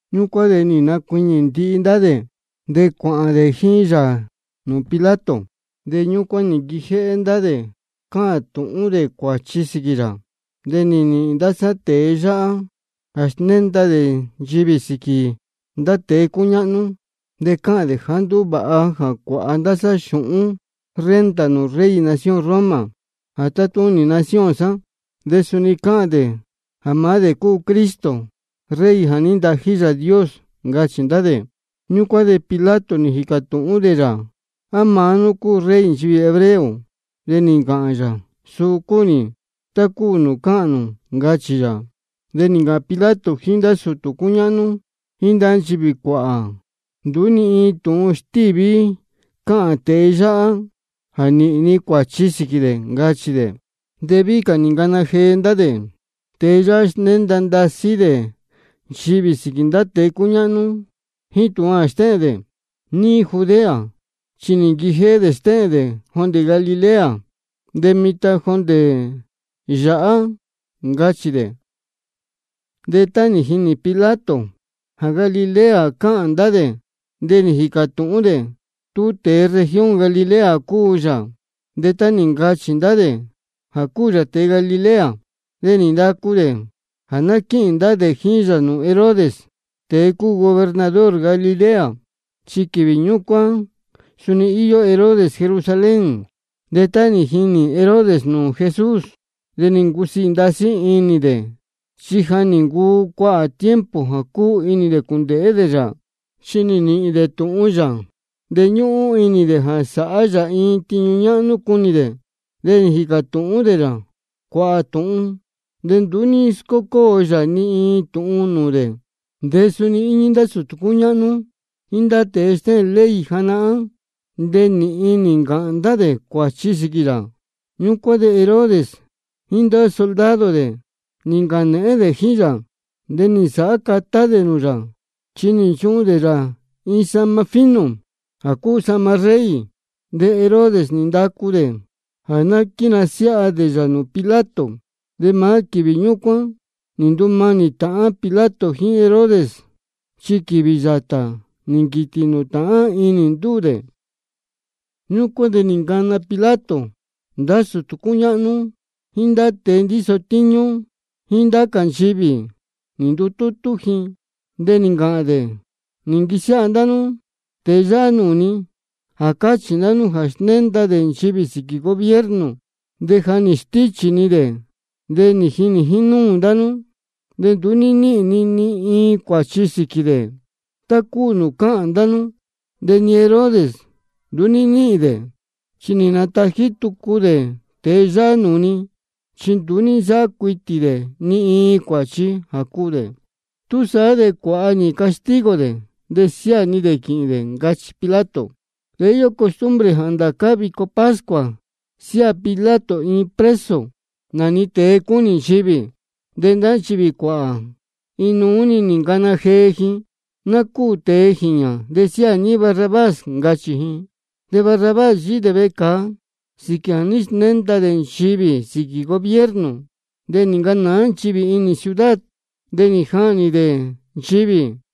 Ñúcuán de nī nacuiñī ndihi ndá dē, de cuāhān dē jíín yā nūū Pilato. De ñúcuán nī nquijéhé ndá dē cáhān tūhún dē cuāchi sīquī yā: Nī nīhīn ndá sá tēe yáhá jā snénda dē nchivī sīquī ndá tēe cúñáhnú. De cáhān dē jāá nduú vāha jā cuāha ndá sá xūhún renta nūū rey nación Roma jā tátúnī nūū nación sá. De suni cáhān dē jā maá dē cúu Cristo, Rey jā ní ntají Yāā Dios, ncachī ndá dē. Ñúcuán de Pilato nī jīcā tūhún dē yā: ¿A maá nú cúu Rey nchivī hebreo? De nī ncāhān yā: Suu cúu nī, tá cúu nūū cáhān nū, ncachī yā. De nī ncāhān Pilato jíín ndá sūtū cúñáhnú jíín ndá nchivī cuāhā: Nduú ni iin tūhun stíví cáhān tēe yáhá jā nīhīn ni cuāchi sīquī dē, ncachī dē. De víhí cā nī ncāhān ndá dē: Tēe yáhá snénda ndasí dē nchivī sīquī ndá tēe cúñáhnú jíín tūhun jā stéhēn dē níí Judea. Chi nī nquijéhé dē stéhēn dē jondē Galilea de mitan de jondē yāhá, ncachī dē. De tá nī jini Pilato jā Galilea cáhān ndá dē, de nī jīcā tūhún dē tú tēe región Galilea cúu yā. De tá nī ncachī ndá dē jā cúu yā tēe Galilea, de nī ndacu dē jā ná quíhīn ndá dē jíín yā nūū Herodes, tēe cúu gobernador Galilea. Chi quīvī ñúcuán suni íyó Herodes Jerusalén. De tá nī jinī Herodes nūū Jesús, de nī ncusiī ndasí inī dē, chi ja nī ncuu cuāhā tiempo jā cúnī dē cūndēhé dē yā. Chi nī nīhīn dē tūhun yā, de ñúhún inī dē jā sāhá yā iin tiñu ñáhnú cunī dē. De nī jīcā tūhún dē yā cuāhā tūhun, de nduú ní scócóo yā ni iin tūhun nūū dē. De suni íñí ndá sūtū cúñáhnú jíín ndá tēe stéhēn ley janahán, de nīhin nī ncāhān ndá dē cuāchi sīquī yā. Ñúcuán de Herodes jíín ndá soldado dē nī ncāhān nēhén dē jíín yā, de nī nsāhá catá dē nūū yā, chi nī nchuhun dē yā iin sahma fino jā cúu sahma rey. De Herodes nī ndacu dē jā ná quínasiáha dē yā nūū Pilato. De maá quīvī ñúcuán nī ndumanī tāhán Pilato jíín Herodes, chi quīvī yātā nī nquītī nūū tāhán inī ndúū dē. Ñúcuán de nī ncana Pilato ndá sūtū cúñáhnú jíín ndá tēe ndíso tíñú jíín ndá cā nchivī, nī ndutútú ji. De nī ncāhān dē: Nī nquisiáha ndá nú tēe yáhá nūū ni, jā cáchī ndá nú jā snénda dē nchivī sīquī gobierno. De ja nī stíchī ni dē, nī jinī jínúū ndá nú. De nduú ní níhīn ni ni iin cuāchi sīquī dē tá cúu nūū cáhān ndá nú. De ni Herodes nduú ní níhīn dē, chi nī natají tucu dē tēe yáhá nūū ni. Chi nduú ní nsáhá cuitī dē ni iin cuāchi jā cuū dē. Túsaá de ná cuáha nī castigo dē de siáā ni dē quīhīn dē, ncachī Pilato. De íyó costumbre jā ndācá vico pascua siáā Pilato iin preso, nā-ni tēe cúnī nchivī. De ndá nchivī cuāhā, iin nuú nī ncana jee ji: Ná cúū tēe jīñā, de siáā ní Barrabás, ncachī ji. De Barrabás yíhí dē vecāa sīquī jā ní snénda dē nchivī sīquī gobierno nī ncanāá ji inī ciudad, de nī jahnī dē ndīyi.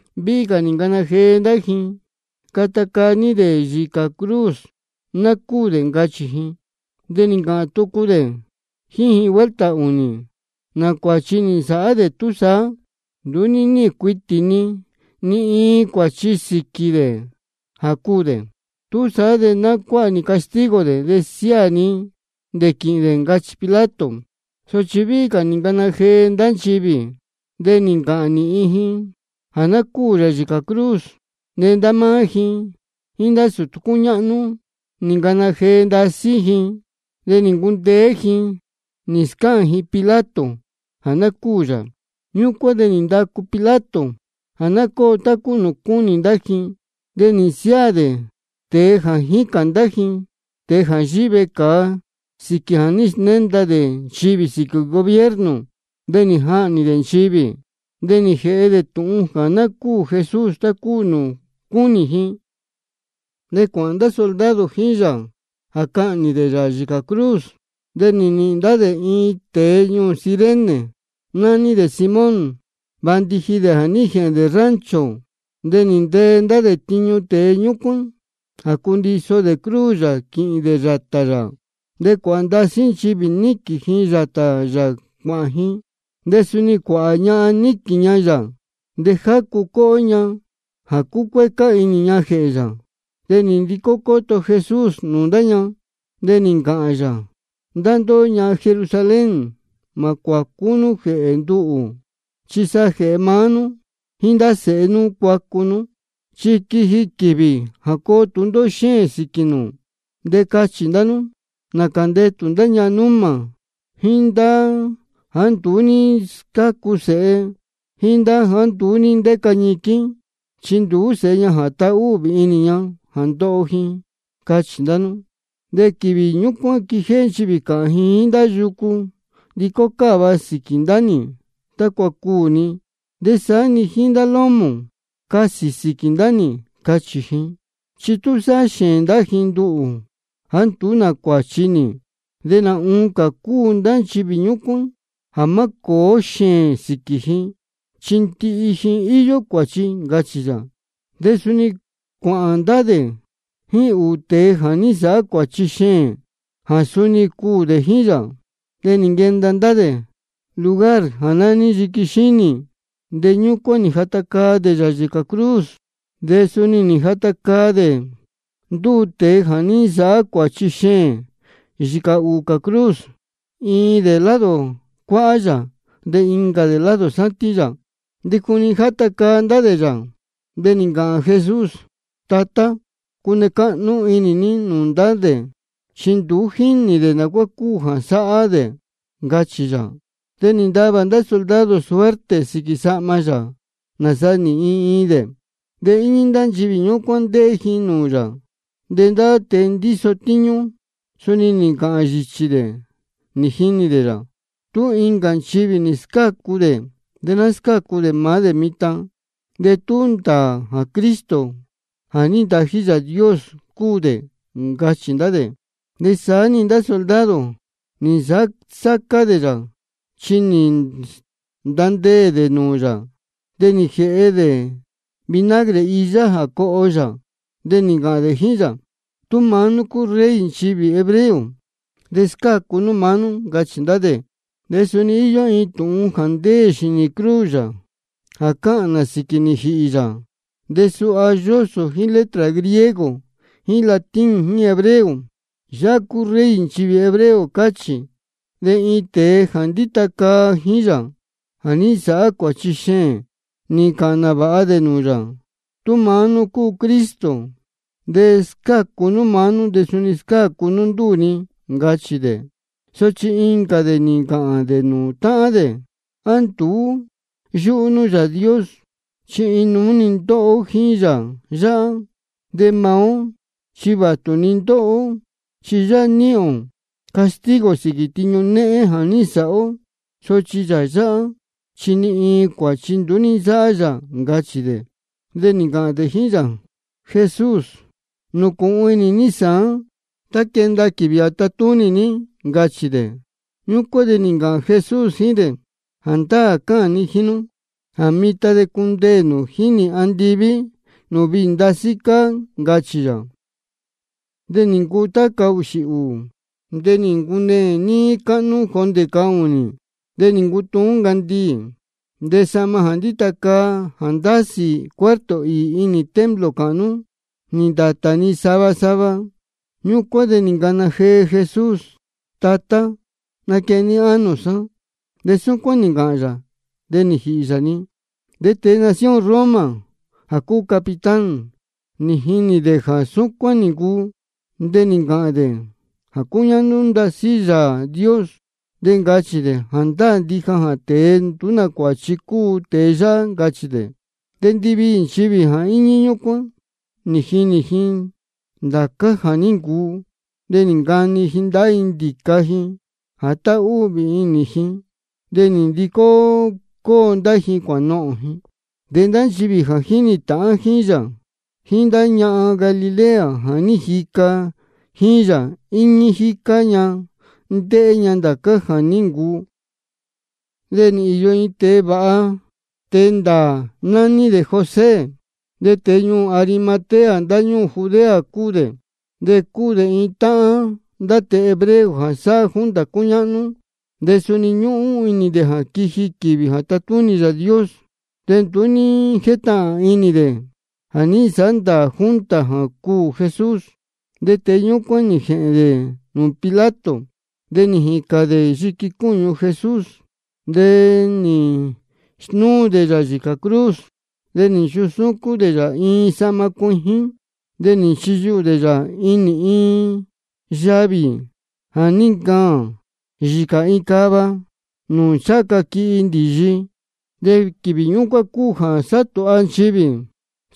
De víhí cā nī ncana jee ndá ji: Cata caa ní dē yīcā cruz, ná cúū dē, ncachī ji. De nī ncāhān tucu dē jíín ji vuelta ūnī: ¿Nā cuāchi nī nsāhá dē túsaá? Nduú ní níhīn cuitī ni ni iin cuāchi sīquī dē jā cuū dē. Túsaá de ná cuáha nī castigo dē, de siáā ni dē quīhīn dē, ncachī Pilato. Sochi víhí cā nī ncana jee ndá nchivī, de nī ncāhān nīhin ji jā ná cúū yā yīcā cruz. De ndá máá ji jíín ndá sūtū cúñáhnú, nī ncana jee ndasí ji. De nī ncundeé ji nī scáhān ji Pilato jā ná cúū yā. Ñúcuán de nī ndacu Pilato jā ná cóo tá cúu nūū cúnī ndá ji. De nī nsiáā dē tēe jā jícān ndá ji, tēe jā yíhí vecāa sīquī jā ní snénda dē nchivī sīquī gobierno, de nī jahnī dē ndīyi. De nī jēhe dē tūhun jā ná cúū Jesús tá cúu nūū cúnī ji. De cuāhān ndá soldado jíín yā jā cahnī dē yā yīcā cruz. De nī nīhīn ndá dē iin tēe ñuū Cirene, nání dē Simón, vāndiji dē jā ní jēhēn dē rancho. De nī ntee ndá dē tiñu tēe ñúcuán jā cuiso dē cruz yā quīhīn dē yātā yā. De cuāhā ndasí nchivī níquīn ji yātā yā cuāhān ji. De suni cuāhā ñahan níquīn ña yā de jácu cóhó ña jā cúcuécá inī ña jēhē yā. De nī ndicó cóto Jesús nūū ndá ña, de nī ncāhān yā: Ndá ndóhó ñahan Jerusalén, mā cuācú nú jēhē nduhū, chi sa jēhē maá nú jíín ndá sēhe nú cuacu nú. Chi quiji quīvī jā coo tūndóhó xéēn sīquī nū, de cachī ndá nú: Nācā ndetū ndá ñahan númā, jíín jāá nduú ní scácu sēhe, jíín jāá nduú ní ndéca ñiquín, chi nduú sēhe ña jā tahúhvī inī ña jā ndoho ji, cachī ndá nú. De quīvī ñúcuán de quijéhé nchivī cāhān ji jíín ndá yucu: Ndicó cáva sīquī ndá nī tácua cuū ni. De saá-ni jíín ndá lómō: Casī sīquī ndá nī, cachī ji. Chi tú sáhá xēēn ndá ji nduhū jāá nduú nā cuāchi nī, de nā oncā cúu ndá nchivī ñúcuán jā má cōó xēēn sīquī ji, chi ndihi ji íyó cuāchi, ncachī yā. De suni cuāhān ndá dē jíín ūū tēe jā ní nsāhá cuāchi xeēn, jā suni cuū dē jíín yā. De nī nquenda ndá dē lugar jā nání Yiqui Xínī, de ñúcuán nī jata caa dē yā yīcā cruz. De suni nī jata caa dē ndúū tēe jā ní nsāhá cuāchi xeēn yīcā ūū cā cruz, iin dē lado cuáhá yā, de incā dē lado sátín yā. De juni játa caa ndá dē yā, de nī ncāhān Jesús: Tatá, cune cáhnú inī ní nūū ndá dē, chi nduú jínī dē nā cuá cúu jā sáhá dē, ncachī yā. De nī ntavā ndá soldado suerte sīquī sahma yā, nāsa nīhīn iin iin dē. De íñí ndá nchivī ñúcuán, ndéhé ji nūū yā. De ndá tēe ndíso tíñú suni nī ncāhān yīchī dē nī jinī dē yā: Tú incā nchivī nī scácu dē, de ná scácu dē maá dē mitan, de tú ndāā jā Cristo jā ní nacāji Yāā Dios cúu dē, ncachī ndá dē. De saá-ni ndá soldado, nī nsāhá sácá dē yā, chi nī ntandeē dē nūū yā, de nī jēhe dē vinagre iyá jā coho yā. De nī ncāhān dē jíín yā: Tú maá nú cúu Rey nchivī hebreo, de scácu nú maá nú, ncachī ndá dē. De suni nī īyo iin tūhun jā ndéē xīnī cruz yā jā cáhān nā sīquī nī jīhī yā, de suha yósō jíín letra griego jíín latín jíín hebreo: Yáhá cúu Rey nchivī hebreo, cáchī. De iin tēe jā ndíta caa jíín yā jā ní nsāhá cuāchi xeēn, nī ncāhān nāvāha dē nūū yā: Tú maá nú cúu Cristo, de scácu nú maá nú de suni scácu nú ndúū ni, ncachī dē. Sochi incā dē nī ncāhān dē nūū táhán dē: ¿A nduú yúhú nú Yāā Dios? Chi iin nuú-ni ndóho ó jíín Yāā yáhá. De maá ó chi vātu-ni ndóho ó, chi yáhá níhīn ō castigo sīquī tiñu néhén jā ní nsāhá ó. Sochi Yāā yáhá chi ni iin cuāchi nduú ní nsáhá yā, ncachī dē. De nī ncāhān dē jíín yā: Jesús, nūcūhun inī ní sāán tá quenda quīvī jā tatúnī ní, ncachī dē. Ñúcuán de nī ncāhān Jesús jíín dē: Jāndáā cáhān ni jíín nú jā mitan de cundeē nū jíín nī andiví nūū viī ndasí cáá, ncachī yā. De nī ncuu tá cahūxī ūū, de nī ncuneē níí cáhnú jondē cahūnī. De nī ncutuún ncandiī. De sahma jā ndíta caa jā ndásī cuarto īī inī templo cāhnú, nī ndātā-ni sava sava. Ñúcuán de nī ncana jee Jesús: Tatá, naquehen ní ánō sá. De súcuán nī ncāhān yā, de nī jīhī yā-ni. De tēe nación Roma jā cúu capitán, nī jinī dē jā súcuán nī ncuu, de nī ncāhān dē jā cúñáhnú ndasí Yāā Dios, de ncachī dē: Jāndáā ndija jā tēe nduú nā cuāchi cúu tēe yáhá, ncachī dē. De ndiviī nchivī jā íñí ñúcuán nī jinī ji ndācá jā ní ncuu, de nī ncani ji ndahá ji ndīca ji jā táhúhvī inī ji, de nī ndicó cóo ndá ji cuānohōn ji. De ndá nchivī jā jínī tāhán jíín yā, jíín ndá ñahan Galilea jā ní jica jíín yā, íñí jícá ña ndéhé ña ndācá jā ní ncuu. De nī īyo iin tēe vāha tēe ndāā, nání dē José. De tēe ñuū Arimatea ndáñúū Judea cúu dē. De cúu dē iin táhán ndá tēe hebreo jā sáhá junta cúñáhnú cā. De suni ñúhún inī dē jā quiji quīvī jā tatúnī Yāā Dios, de nduú ní jétahān inī dē jā ní nsāhá ndāā junta jā cuū Jesús. De tēe ñúcuán nī jēhēn dē nūū Pilato, de nī jīcān dē yiqui cúñu Jesús. De nī snúu dē yā yīcā cruz, de nī nchusúcún dē yā iin sahma cuijín. De nī nchiyuhū dē yā inī iin yavī jā ní ncaān yīcā iin cava, nūū ncháha ca quihi ndīyi. De quīvī ñúcuán cúu jā sátūha nchivī,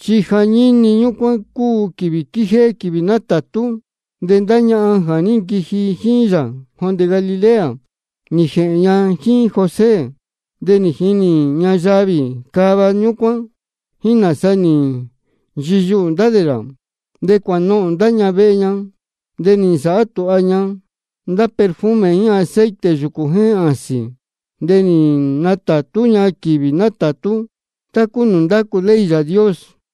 chi jañíni ñúcuán cúu jā quíjéhé quīvī nátātú. De ndá ñahan jā ní nquiji jíín yā jondē Galilea, nī jēhēn ña jíín José, de nī jinī ña yavī cava ñúcuán, jíín nāsa nī nchiyuhū ndá dē yā. De cuānohōn ndá ña vehe ña, de nī nsāhá tūha ña ndá perfume jíín aceite yūcū jéhēn āsīn. De nī natātú ña quīvī nátātú, tá cúu nūū ndácu ley Yāā Dios.